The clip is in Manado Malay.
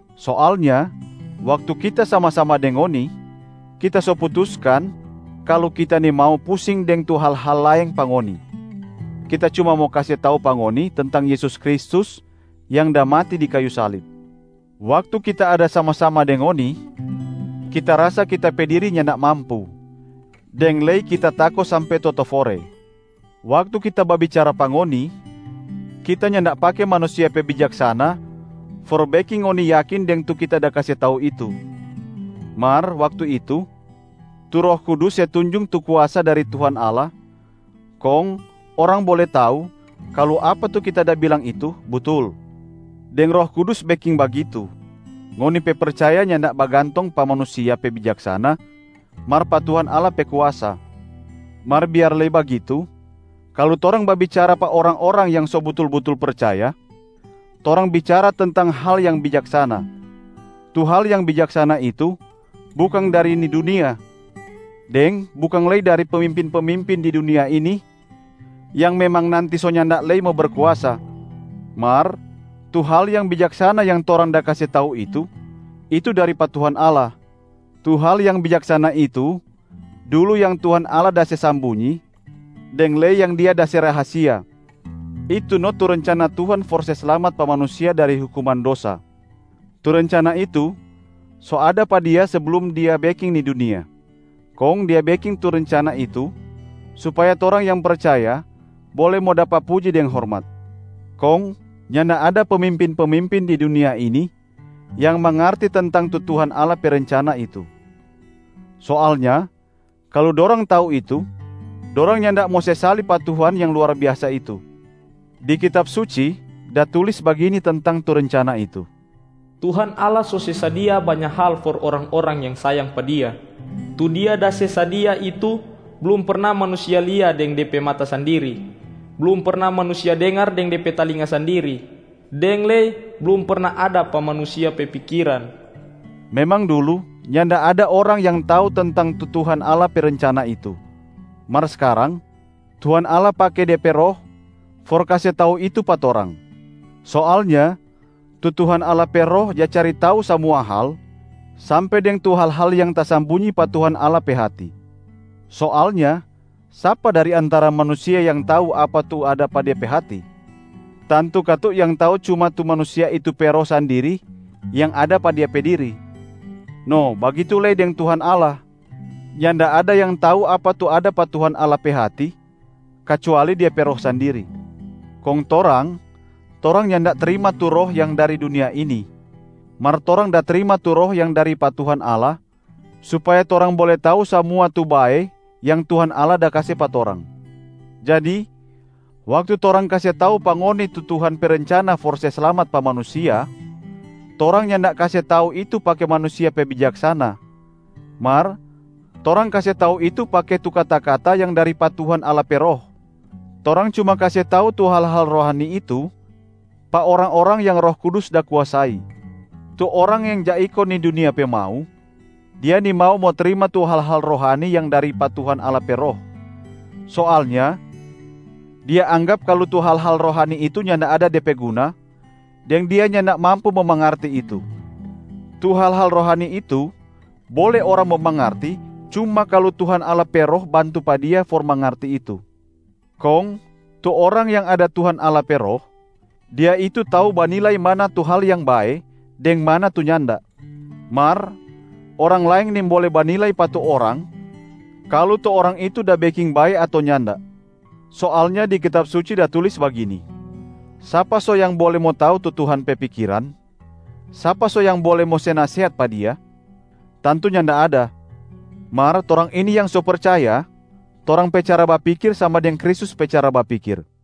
Soalnya waktu kita sama-sama deng ngoni, kita so putuskan kalu kita nimau pusing deng tu hal-hal laeng pa ngoni, kita cuma mo kase tau pa ngoni tentang Yesus Kristus yang da mati di kayu salib. Waktu kita ada sama-sama deng ngoni, kita rasa kita pe diri nyanda mampu, deng lei kita tako sampe totofore. Waktu kita babicara pa ngoni, kita nyanda pake manusia pe bijaksana for beking ngoni yakin deng tu kita da kase tau itu. Mar waktu itu, tu Roh Kudus se tunjung tu kuasa dari Tuhan Allah kong orang bole tau kalu apa tu kita da bilang itu butul. Deng Roh Kudus beking bagitu, ngoni pe percaya nyanda bagantong pa manusia pe bijaksana mar pa Tuhan Allah pe kuasa. Mar biar lei bagitu, kalu torang babicara pa orang-orang yang so butul-butul percaya, torang bicara tentang hal yang bijaksana. Tu hal yang bijaksana itu bukang dari ni dunia, deng bukang lei dari pemimpin-pemimpin di dunia ini yang memang nanti so nyanda lei mo berkuasa. Mar tu hal yang bijaksana yang torang da kase tau itu, itu dari pa Tuhan Allah. Tu hal yang bijaksana itu dulu yang Tuhan Allah da se sambunyi, deng lei yang Dia da se rahasia. Itu no tu rencana Tuhan for se slamat pa manusia dari hukuman dosa. Tu rencana itu so ada pa Dia seblum Dia beking ni dunia, kong Dia beking tu rencana itu supaya torang yang percaya bole mo dapa puji deng hormat. Kong nyanda ada pemimpin-pemimpin di dunia ini yang mangarti tentang tu Tuhan Allah pe rencana itu. Soalnya kalu dorang tau itu, dorang nyanda mo se salib pa Tuhan yang luar biasa itu. Di Kitab Suci da tulis bagini tentang tu rencana itu, “Tuhan Allah so se sadia banya hal for orang-orang yang sayang pa Dia. Tu Dia da se sadia itu blum perna manusia lia deng de pe mata sandiri, blum perna manusia dengar deng de pe talinga sandiri, deng lei blum perna ada pa manusia pe pikiran.” Memang dulu nyanda ada orang yang tau tentang tu Tuhan Allah pe rencana itu, mar skarang Tuhan Allah pake De pe Roh for kase tau itu pa torang. Soalnya tu Tuhan Allah pe Roh ja cari tau samua hal sampe deng tu hal-hal yang tasambunyi pa Tuhan Allah pe hati. Soalnya sapa dari antara manusia yang tau apa tu ada pa de pe hati? Tantu katu yang tau cuma tu manusia itu pe roh sandiri yang ada pa de pe diri. No bagitu lei deng Tuhan Allah, nyanda ada yang tau apa tu ada pa Tuhan Allah pe hati kacuali Dia pe Roh sandiri. Kong torang, torang nyanda trima tu roh yang dari dunia ini, mar torang da trima tu Roh yang dari pa Tuhan Allah supaya torang bole tau samua tu bae yang Tuhan Allah da kase pa torang. Jadi waktu torang kase tau pa ngoni tu Tuhan pe rencana for se slamat pa manusia, torang nyanda kase tau itu pake manusia pe bijaksana, mar torang kase tau itu pake tu kata-kata yang dari pa Tuhan Allah pe Roh. Torang cuma kase tau tu hal-hal rohani itu pa orang-orang yang Roh Kudus da kuasai. Tu orang yang ja iko ni dunia pe mau, dia nimau mo trima tu hal-hal rohani yang dari pa Tuhan Allah pe Roh. Soalnya dia anggap kalu tu hal-hal rohani itu nyanda ada de pe guna deng dia nyanda mampu mo mangarti itu. Tu hal-hal rohani itu bole orang mo mangarti cuma kalu Tuhan Allah pe Roh bantu pa dia for mangarti itu. Kong tu orang yang ada Tuhan Allah pe Roh, dia itu tau banilai mana tu hal yang bae deng mana tu nyanda. Mar orang laeng nimbole banilai pa tu orang kalu tu orang itu da beking bae ato nyanda. Soalnya di Kitab Suci da tulis bagini, “Sapa so yang bole mo tau tu Tuhan pe pikiran? Sapa so yang bole mo se nasehat pa Dia? Tantu nyanda ada.” Mar torang ini yang so percaya, torang pe cara bapikir sama deng Kristus pe cara bapikir.